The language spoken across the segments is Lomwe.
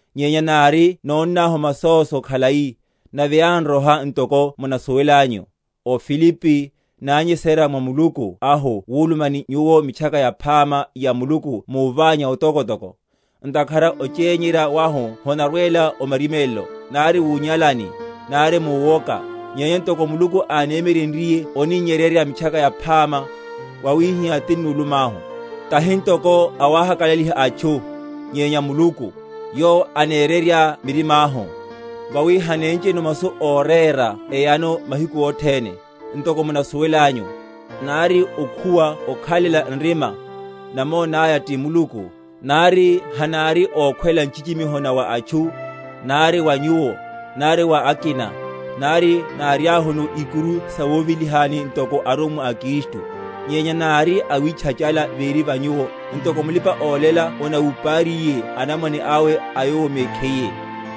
nyenya nari nónnahu masóso khalai, nave yánroha, ntoko munasuwelanyu, o Filipi, nányesererya mwa Muluku ahu wuluma ni nyuwo Mitchaka Yaphama ya Muluku muványa otokotoko. Ntakhara ochényerya wahu honarwela o marimélelo, nari wunyalani, nari muwoka; nyenya ntoko Muluku ánemyeryenryiye oninnyeryerya Mitchaka Yaphama, wawihihá tinnu?-?lumahu; tahi ntoko awahakalaliha atchu, nyenya Muluku; yowo anererya mirimáhu. Vawi hanéncheno masu órera eyano mahiku othene, ntoko munasuwelanyu, nari okhuwa okhalela nrima, namonáya ti Muluku; nari hanári ókhwela nchichimiho na wa atchu, nari wa nyuwo, nari wa akina, nari náriahuno ikuru sawovelihani ntoko arummwa a Kristu. Nyenya nári awitchachala véri va nyuwo, ntoko mulipa‐olela onawupariye anamwane awe a yowo mekhiye;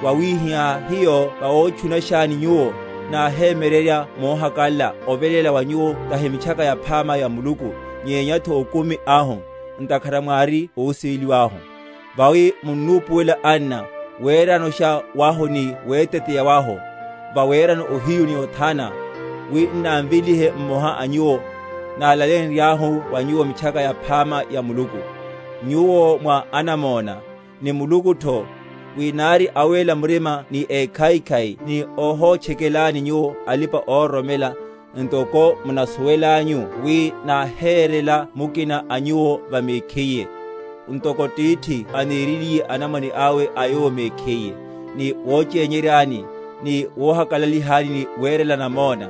wawihihá hiyo vawotchunashani nyuwo, náhemyeryerya mohakalala oveléla wa nyuwo tahi Mitchakaru Yaphama ya Muluku, nyenyatho okumi ahu, ntakhara mwári ósiveliwa ahu. Vawi munnupuwela, anna, weranosha wahu ni weteteya wahu; vawerano ohiyu ni othana, wi n’námvelihe mmoha a nyuwo, nálaleyenryahu wa nyuwo Mitchaka Yaphama ya Muluku. Nyuwo mwa anamona, ni Mulukutho, wi nári awéla murima ni ékhaikhai ni óhotchekelani nyuwo alipa‐ororomela; ntoko munasuwelanyu wi náherela mukina a nyuwo va mekhiye, ntoko tithi anereliye anamwane awe a yowo mekhiye, ni wochényeryani, ni wohakalalihani ni werela namona,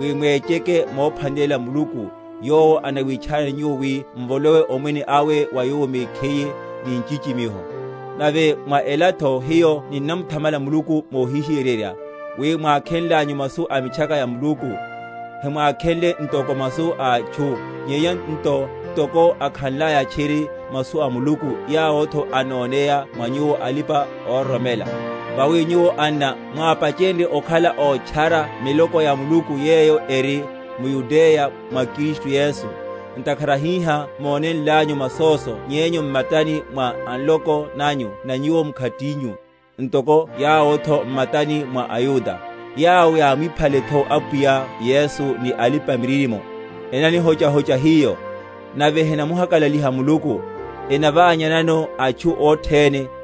wi mwecheke momphwanelela Muluku, yowo anawitchanani nyuwo wi mvolowe omwene awe wa Yowo mekhiye, ni nchichimiho. Nave mwa elatho hiyo ninnamuthamala Muluku mohihiyeryerya, wi, mwákhenlanyu masu a Mitchaka ya Muluku, hemwákhenle ntoko masu a atchu, nyenya nto ntoko akhanlaya tchiri, masu a Muluku, yawotho anoneya mwa nyuwo alipa‐ororomela. Vawi nyuwo, anna, mwápachenrye okhala ótchara miloko ya Muluku yeyo eri m’Yudeya mwa Kristu Yesu; ntakhara hiha mónenlanyu masóso nyenyu m’matani mwa a nloko nanyu na nyuwo mkhatinyu, ntoko yawotho m’mataní mwa aYuda; yawo yámwiphaletho Apwiya Yesu, ni alipa‐miririmo, enanihochahocha hiyo, nave henamuhakalaliha Muluku, enaványanano atchu othene;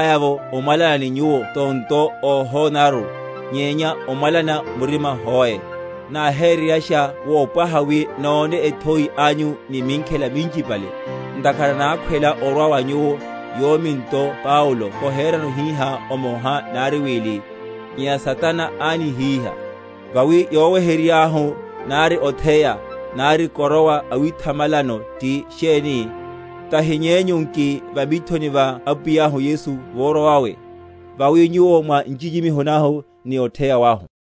Nyenya hiyo, anna, nari yánivíhalaya’vo omwalana ni nyuwo tonto, óhonanaru, nyenya omwalana murima hoe, náhereryasha wopwaha wi nóne ethoi anyu ni minkhela minchipale; ntakhara nákhwela orwa wa nyuwo, yomi nto Paulo koherano hihá omoha nari wili; nyenya Satana ánihíha. Vawi yoweheryeryáhu, nari otheya, nari koroa awithamalelano ti sheni? tahi nyenyu nki, va mithoni va Apwiyahu Yesu vorwa vawe? Vawi nyuwo mwa nchichimiho nahu ni otheya wahu.